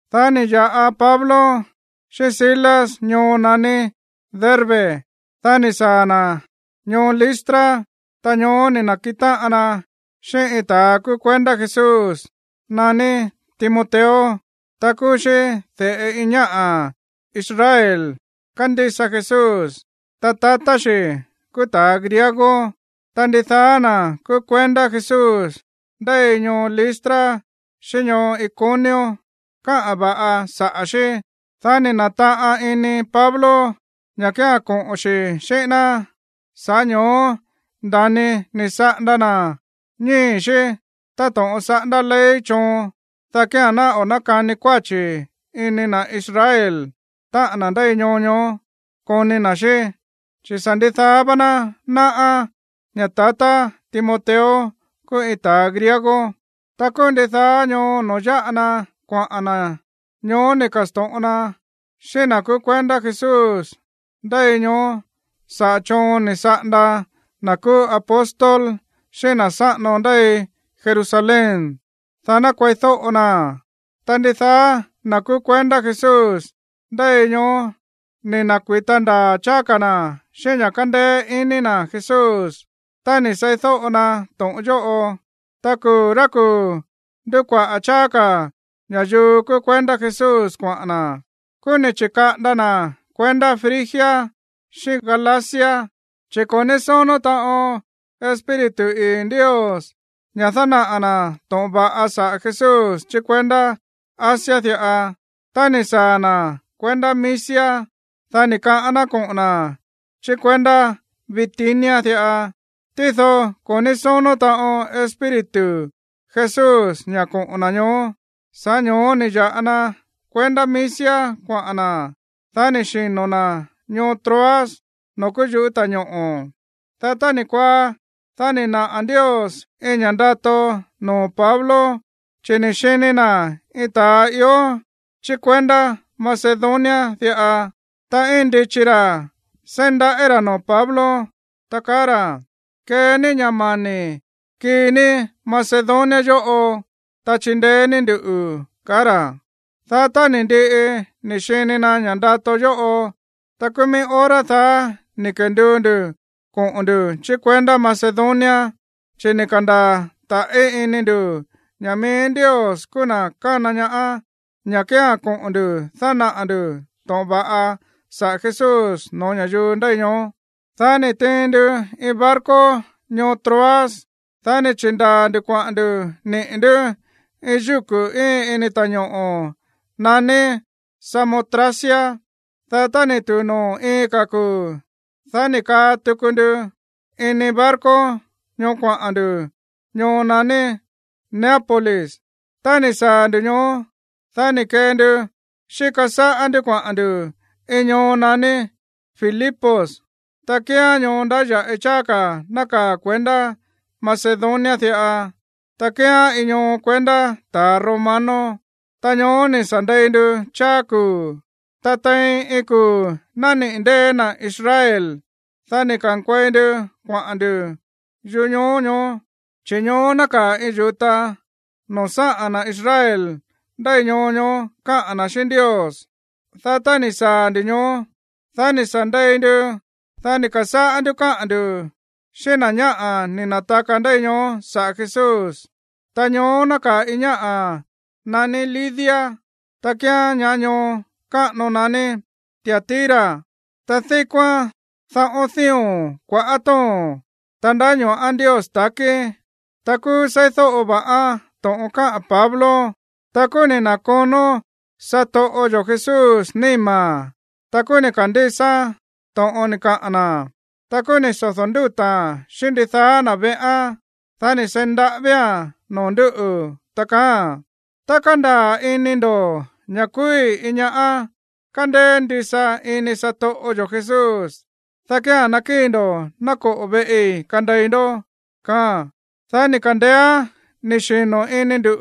Dá ni̱ ya̱ꞌa Pablo xíꞌín Silas ñoo naní Derbe, dá ni̱ saa̱ na̱ ñoo Listra. Ta ñoó ni̱ na̱kiꞌin táꞌan na xíꞌín iin ta̱a kúú kuendá Jesús naní Timoteo. Ta kúú xí de̱ꞌe iin ñáꞌa̱ Israel kándísa Jesús. Ta tatá xi̱ kúú ta̱a griego. Ta ndidaá na̱ kúú kuendá Jesús ndéi ñoo Listra xíꞌín ñoo Iconio káꞌa̱n va̱ꞌa saꞌa̱ xí. Dá ni̱ na̱taꞌan ini Pablo ña̱ kía̱n koꞌo̱n xi̱ xíꞌín ná. Sa̱ꞌá ño̱ó nda̱ni ni̱ saꞌanda na̱ ñíi̱ xí táto̱ꞌon saꞌándá ley choon, dá kía̱n ná o̱ nákani kuáchi̱ ini na̱ Israel, táꞌa̱n na̱ ndéi ñoo ñoó, koni na̱ xí. Chi̱ sa̱ ndidaá vá ná náꞌá ña̱ tatá Timoteo kúú iin ta̱ griego. Ta kúú ndidaá ñoo no̱ó yáꞌa na kuaꞌa̱n na̱, ñoó ni̱ ka̱sto̱ꞌon na xíꞌín na̱ kúú kuendá Jesús ndéi ñoó saꞌa̱ choon ni̱ saꞌanda na̱ kúú apóstol xíꞌín na̱ sáꞌano ndéi Jerusalén, dá ná kueídóꞌo naa̱n. Ta ndidaá na̱ kúú kuendá Jesús ndéi ñoó ni̱ na̱kui̱ta ndaa̱ cháá ka̱ na̱ xíꞌín ña̱ kándéé iní na̱ Jesús tá ni̱ seídóꞌo na to̱ꞌon yóꞌo. Ta kuu̱ rá kuu̱ ndúkuaꞌa̱ cháá ka̱ ña̱yuu kúú kuendá Jesús kuaꞌa̱n na̱. Kúú ni̱ chi̱kaꞌanda na̱ kuendá Frigia xíꞌín Galacia, chi̱ ko̱ ní sónó taꞌon Espíritu ii̱ Ndios ña̱ dánaꞌa̱ na̱ to̱ꞌon va̱ꞌa saꞌa̱ Jesús chí kuendá Asia diꞌa. Tá ni̱ saa̱ na̱ kuendá Misia, dá ni̱ kaꞌán ná koꞌo̱n na̱ chí kuendá Bitinia diꞌa, tído ko̱ ní sónó taꞌon Espíritu Jesús ña̱ koꞌo̱n na̱ ñoó. Sa̱ꞌá ño̱ó ni̱ ya̱ꞌa na kuendá Misia kuaꞌa̱n na̱, dá ni̱ xino̱ na̱ ñoo Troas noo̱ kúú yuꞌú ta̱ñoꞌo̱. Dá tá ni̱ kuaá, dá ni̱ naꞌa̱ Ndios iin ña̱ ndato noo̱ Pablo, chi̱ ni̱ xini na̱ iin ta̱a ió chí kuendá Macedonia diꞌa. Ta íin ndichi ra̱ seí ndaꞌí ra̱ noo̱ Pablo, ta kaá ra̱: “Kee ní ña̱ mani̱ kii ní Macedonia yóꞌo, ta chindeé ní nduꞌu̱”, kaá ra̱. Dá tá ni̱ ndiꞌi ni̱ xini na̱ ña̱ꞌa ndato yóꞌo, ta kúú mií hora daá ni̱ kenduu ndu̱ koꞌo̱n ndu̱ chí kuendá Macedonia, chi̱ ni̱ ka̱ndaa̱ ta̱ꞌí ini ndu̱ ña̱ mií Ndios kúú na̱ kana ñaá ña̱ kía̱n koꞌo̱n ndu̱ dánaꞌa̱ ndu̱ to̱ꞌon va̱ꞌa saꞌa̱ Jesús no̱ó ña̱yuu ndéi ñoó. Dá ni̱ tiin ndu iin barco ñoo Troas. Dá ni̱ chi̱ndaa̱ ndu̱ kuaꞌa̱n ndu̱ niꞌi̱ ndú iin yúku̱ íin ini ta̱ñoꞌo̱ naní Samotracia. Dá tá ni̱ tu̱u noo̱ iin ka̱ kuu̱, dá ni̱ kaa tuku ndu ini barco ñoó kuaꞌa̱n ndu̱ ñoo naní Neápolis. Tá ni̱ saa̱ ndu̱ ñoó, dá ni̱ kee ndu xíka sáꞌá ndú kuaꞌa̱n ndu̱ iin ñoo naní Filipos, ta kíán ñoo ndáya̱ꞌi cháá ka̱ nákaa̱ kuendá Macedonia diꞌa, ta kíán iin ñoo kuendá ta̱ romano. Ta ñoó ni̱ sa̱ ndei ndu cháá kuu̱. Ta tein iin kuu̱ nániꞌi̱ ndée̱ na̱ Israel, dá ni̱ ka̱nkuei ndu kuaꞌa̱n ndu̱ yuꞌú ñoo ñoó, chi̱ ñoó nákaa̱ iin yu̱ta noo̱ sáꞌa̱n na̱ Israel ndéi ñoo ñoó káꞌa̱n na̱ xíꞌín Ndios. Dá tá ni̱ saa̱ ndu̱ ñoó, dá ni̱ sa̱ ndei ndu. Dá ni̱ ka̱sáꞌá ndú káꞌa̱n ndu̱ xíꞌín na̱ ñáꞌa̱ ni̱ na̱taka ndéi ñoó saꞌa̱ Jesús. Ta ñoó nákaa̱ iin ñáꞌa̱ naní Lidia. Ta kíán ñá ñoo káꞌano naní Tiatira, ta díkóán dáꞌo̱n dío̱n kuaꞌá to̱ón, ta ndáño̱ꞌán Ndios ta̱kí. Ta kúú seídóꞌo va̱ꞌán to̱ꞌon káꞌa̱n Pablo. Ta kúú ni̱ na̱konó satoꞌo yo̱ Jesús níma̱n, ta kúú ni̱ ka̱ndísáán to̱ꞌon ni̱ kaꞌa̱n na̱. Ta kúú ni̱ sodo̱ ndúta̱a̱n xíꞌín ndidaá na̱ veꞌán. Dá ni̱ seí ndaꞌávía̱n noo̱ ndú, ta kaáa̱n: ―Tá kándaa̱ ini ndo̱ ña̱ kúúí iin ñáꞌa̱ kándéé ndisa iníi̱ satoꞌo yo̱ Jesús, dá kía̱n nákíi̱ ndo̱ ná koꞌo̱ veꞌi kandei ndó ―kaáa̱n. Dá ni̱ ka̱ndeéán ni̱ xino̱ ini ndu̱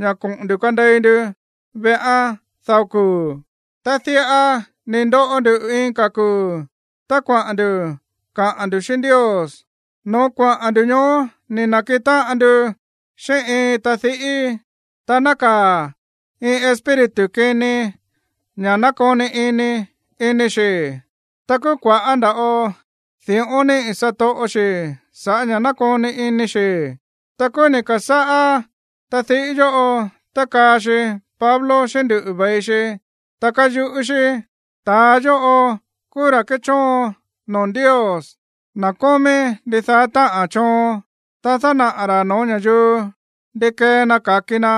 ña̱ koꞌo̱n ndu̱ kandei ndu veꞌán dao kuu̱. Ta diꞌa ni̱ ndoꞌo ndu iin ka̱ kuu̱ tá kuaꞌa̱n ndu̱ kaꞌa̱n ndu̱ xíꞌín Ndios. No̱ó kuaꞌa̱n ndu̱ ñoó ni̱ na̱kiꞌin táꞌan ndu xíꞌín iin tadiꞌí. Ta nákaa̱ iin espíritu kini ña̱ nákoni iní ini xi̱. Ta kúú kua̱ꞌá nda̱ꞌo di̱ꞌón níꞌi̱ satoꞌo xi̱ sa̱ꞌá ña̱ nákoni iní xi̱. Ta kúú ni̱ ka̱sáꞌá tadiꞌí yóꞌo tákaa xi Pablo xíꞌín nduꞌu̱ ve̱i xi, ta káyuꞌú xí: ―¡Ta̱a yóꞌo kúú ra̱ kéchóon noo̱ Ndios, na̱ kómí ndidaá táꞌa̱n choon! Ta dánaꞌa̱ ra̱ no̱ó ña̱yuu ndi kee na ka̱ki na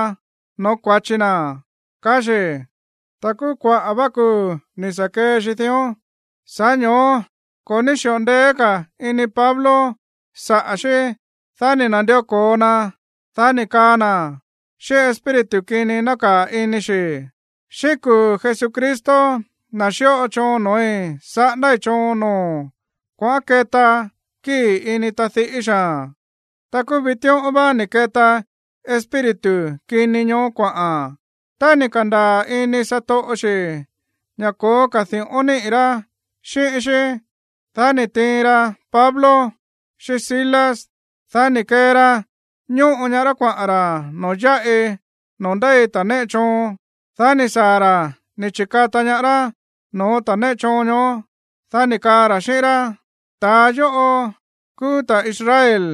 no̱ó kua̱chi na̱ ―kaá xi̱. Ta kúú kuaꞌa̱ vá kuu̱ ni̱ sa̱ kee xi dión. Sa̱ꞌá ño̱ó ko̱ ní xi̱ꞌo ndeé ka̱ ini Pablo saꞌa̱ xí. Dá ni̱ na̱ndió ko̱o na, dá ni̱ kaa na̱ xíꞌín espíritu kini nákaa̱ ini xi̱: ―Xíꞌín kuu̱ Jesucristo, na̱ xíꞌo choon no̱ói̱, saꞌándái̱ choon noo̱o̱n. Kuaꞌán keta kíi̱ ini tadiꞌí xaa̱n. Ta kúú vitíꞌón vá ni̱ keta espíritu kini ñoó kuaꞌa̱n. Tá ni̱ ka̱ndaa̱ ini satoꞌo xi̱ ña̱ ko̱ó ka̱ di̱ꞌón niꞌi̱ rá xíꞌín xí, dá ni̱ tiin ra Pablo xíꞌín Silas. Dá ni̱ kee ra ñóꞌo ñaá rá kuaꞌa̱n ra̱ noo̱ yáꞌi noo̱ ndéi ta̱ néꞌe choon. Dá ni̱ saa̱ ra̱ ni̱ chi̱kata ñaá rá no̱ó ta̱ néꞌe choon ñoó. Dá ni̱ kaa ra̱ xíꞌín rá: ―Ta̱a yóꞌo kúú ta̱ Israel.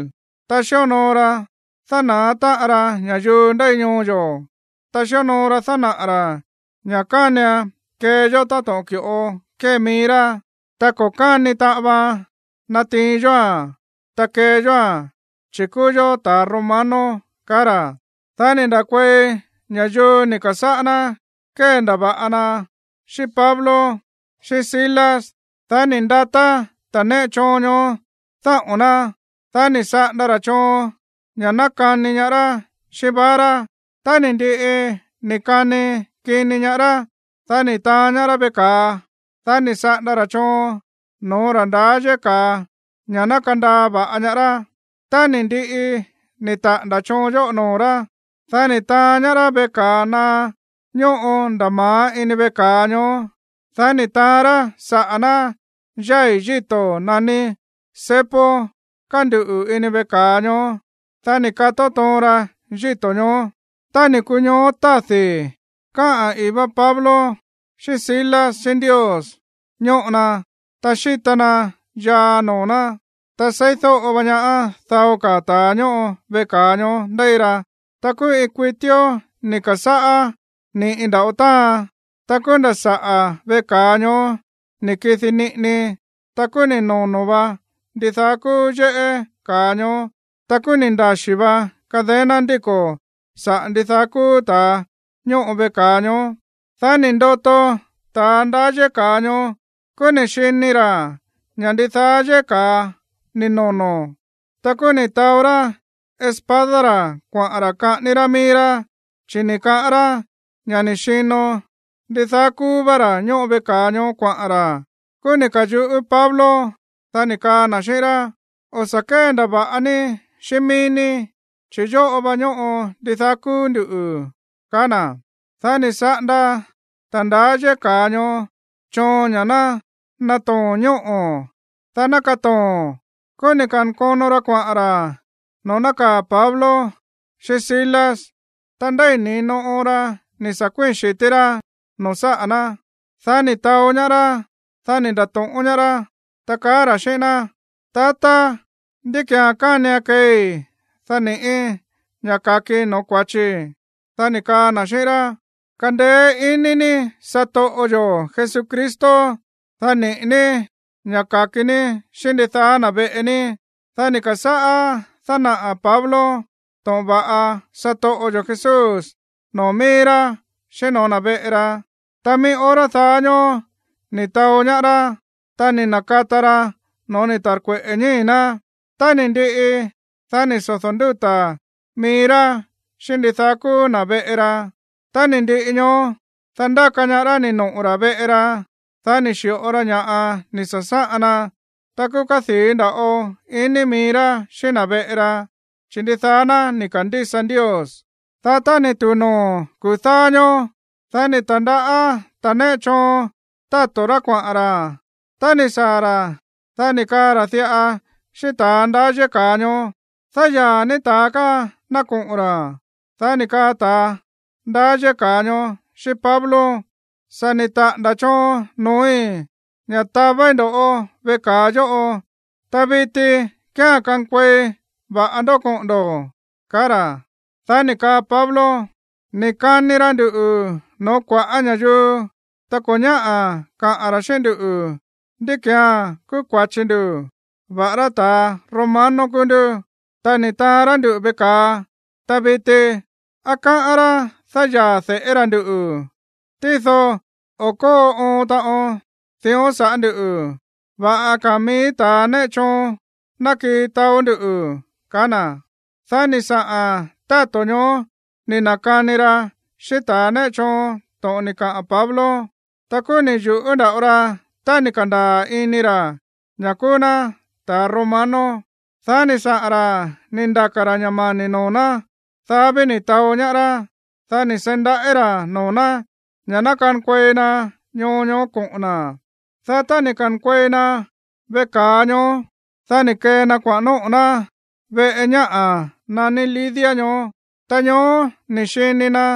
Ta xíonoo ra dána̱á táꞌan ra ña̱yuu ndéi ñoo yo̱. Ta xíonoo ra dánaꞌa̱ ra̱ ña̱ kánian kee yó táto̱ꞌon ki̱ꞌo kée mií rá, ta ko̱ káni taꞌan vaan natiin yóa̱n, ta kee yóa̱n, chi̱ kúú yó ta̱ romano ―kaá ra̱. Dá ni̱ nda̱kuei ña̱yuu ni̱ ka̱sáꞌá ná kéndava̱ꞌa na xíꞌín Pablo, xíꞌín Silas. Dá ni̱ ndatá ta̱ néꞌe choon ñoó dáꞌo̱n ná. Dá ni̱ saꞌanda ra̱ choon ña̱ ná kani ñaá rá xíꞌín vara. Tá ni̱ ndiꞌi ni̱ kani kini ñaá rá, dá ni̱ taán ñaá rá veꞌe ka̱a. Dá ni̱ saꞌanda ra̱ choon no̱ó ra̱ ndaá yéꞌé ka̱a ña̱ ná kandaa va̱ꞌa ñaá rá. Tá ni̱ ndiꞌi ni̱ taꞌa̱nda̱ choon yóꞌo noo̱ rá, dá ni̱ taán ñaá rá veꞌe ka̱a naá ñóꞌo nda̱ ma̱á ini veꞌe ka̱a ñoó. Dá ni̱ taán rá saꞌa̱ ná yái̱ yíto̱ naní cepo kánduꞌu̱ ini veꞌe ka̱a ñoó, dá ni̱ kató toon ra yíto̱ ñoó. Tá ni̱ kuu ñoó tádi̱, káꞌa̱n ii̱ vá Pablo xíꞌín Silas xíꞌín Ndios ñóꞌo na, ta xíta na yaa noo̱ ná. Ta seídóꞌo va̱ꞌa ñaá dao ka̱ ta̱a ñóꞌo veꞌe ka̱a ñoó ndéi ra. Ta kúú iin kuitíó ni̱ ka̱sáꞌá ni̱ꞌi nda̱ꞌo táan. Ta kúú nda̱ saꞌa̱ véꞌe ka̱a ñoó ni̱ kidi niꞌini. Ta kúú ni̱ nono̱ vá ndidaá kúú yéꞌé ka̱a ñoó. Ta kúú ni̱ ndaxí vá cadena ndíko̱ saꞌa̱ ndidaá kúú ta̱a ñóꞌo veꞌe ka̱a ñoó. Dá ni̱ ndoto ta̱ ndaá yéꞌé ka̱a ñoó, kúú ni̱ xini ra̱ ña̱ ndidaá yéꞌé ka̱a ni̱ nono̱. Ta kúú ni̱ taó rá espada ra̱ kuaꞌa̱n ra̱ kaꞌání rá mií rá, chi̱ ni̱ kaꞌán rá ña̱ ni̱ xino ndidaá kúú vá ra̱ ñóꞌo veꞌe ka̱a ñoó kuaꞌa̱n ra̱. Kúú ni̱ ka̱yuꞌú Pablo, dá ni̱ kaa na̱ xíꞌín rá: ―O̱ sa̱ kéndava̱ꞌa ní xíꞌín mií ní, chi̱ yóꞌo va ñóꞌo ndidaá kúú nduꞌu̱ ―kaá na̱. Dá ni̱ saꞌanda ta̱ ndaá yéꞌé ka̱a ñoó choon ña̱ ná natoo̱n ñóꞌo̱, dá ná katoo̱n. Kúú ni̱ ka̱nkono ra kuaꞌa̱n ra̱ noo̱ nákaa̱ Pablo xíꞌín Silas. Ta ndéi̱ ni̱no oon ra ni̱ sa̱ kuíi̱n xi̱tí rá noo̱ sáꞌa̱ ná. Dá ni̱ taó ñaá rá, dá ni̱ nda̱to̱ꞌón ñaá rá, ta kaá ra̱ xíꞌín ná: ―Tatá, ¿ndí ki̱án kánian keei, dá ni̱ꞌí ña̱ ka̱kii no̱ó kua̱chii̱? Dá ni̱ kaa na̱ xíꞌín rá: ―Kandeé iní ní satoꞌo yo̱ Jesucristo, dá niꞌi̱ ní ña̱ ka̱ki ní xíꞌín ndidaá na̱ veꞌe ní. Dá ni̱ ka̱sáꞌá dánaꞌa̱ Pablo to̱ꞌon va̱ꞌa satoꞌo yo̱ Jesús noo̱ mií rá, xíꞌín no̱ó na̱ veꞌe ra. Ta mií hora daá ñóó ni̱ taó ñaá rá, ta ni̱ na̱kata ra no̱ó ni̱ ta̱rkueꞌe̱ ñíi̱ ná. Tá ni̱ ndiꞌi, dá ni̱ sodo̱ ndúta̱ mií rá xíꞌín ndidaá kúú na̱ veꞌe ra. Tá ni̱ ndiꞌi ñoó, dá ndáka ñaá rá ni̱ noꞌo̱ ra̱ veꞌe ra. Dá ni̱ xi̱ꞌo ra ña̱ꞌa ni̱ sa̱sáꞌan na. Ta kúú kádii̱ nda̱ꞌo ini mií rá xíꞌín na̱ veꞌe ra, chi̱ ndidaá ná ni̱ ka̱ndísa Ndios. Dá tá ni̱ tu̱u noo̱ kuu̱ dáá ñóó, dá ni̱ ta̱ndaꞌá ta̱a néꞌe choon táto̱ rá kuaꞌa̱n ra̱. Tá ni̱ saa̱ ra̱, dá ni̱ kaa ra̱ diꞌa xíꞌín ta̱ ndaá yéꞌé ka̱a ñoó: ―Dáyaa̱ ní ta̱a káa ná koꞌo̱n ra̱. Dá ni̱ kaa ta̱ ndaá yéꞌé ka̱a ñoó xíꞌín Pablo: ―Sa̱ ni̱ taꞌa̱nda̱ choon noo̱í ña̱ tavéí ndo̱ꞌó veꞌe ka̱a yóꞌo. Ta viti kía̱n kankuei va̱ꞌa ndó koꞌo̱n ndo̱ ―kaá ra̱. Dá ni̱ kaa Pablo: ―Ni̱ kani ra nduꞌu̱ noo̱ kua̱ꞌá ña̱yuu, ta ko̱ ñáꞌa̱ kaꞌa̱n ra̱ xíꞌín nduꞌu̱ ndí ki̱án kúú kua̱chi ndu̱, va̱ꞌará ta̱ romano kúú ndú. Ta ni̱ taán rá nduꞌu̱ veꞌe ka̱a. Ta viti, ¿á káꞌán rá dáyaa̱ de̱ꞌé ra̱ ndú? Tído o̱ kóo oon taꞌon dión saꞌa̱ ndú. Va̱ꞌa ka̱a̱n mií ta̱ néꞌe choon ná kii taó nduꞌu̱ ―kaá na̱. Dá ni̱ saꞌa̱n táto̱ ñoó ni̱ na̱kani ra xíꞌín ta̱ néꞌe choon to̱ꞌon ni̱ kaꞌa̱n Pablo. Tá kúú ni̱ yu̱ꞌú nda̱ꞌo ra tá ni̱ ka̱ndaa̱ ini ra̱ ña̱ kúú ná ta̱ romano. Dá ni̱ saꞌa̱n ra̱ ni̱ ndaka̱ ra̱ ña̱ mani̱ noo̱ ná. Dá ví ni̱ taó ñaá rá. Dá ni̱ seí ndaꞌí ra̱ noo̱ ná ña̱ ná kankuei na ñoo ñoó koꞌo̱n na̱. Dá tá ni̱ ka̱nkuei na veꞌe ka̱a ñoó, dá ni̱ kee na kuaꞌa̱n nóꞌo̱ ná veꞌe ñáꞌa̱ naní Lidia ñoó. Ta ñoó ni̱ xini na̱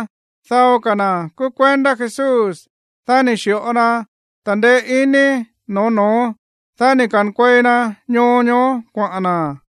dao ka̱ na̱ kúú kuendá Jesús. Dá ni̱ xi̱ꞌo na ta̱ndeé iní noo̱ no̱ón. Dá ni̱ ka̱nkuei na ñoo ñoó kuaꞌa̱n na̱.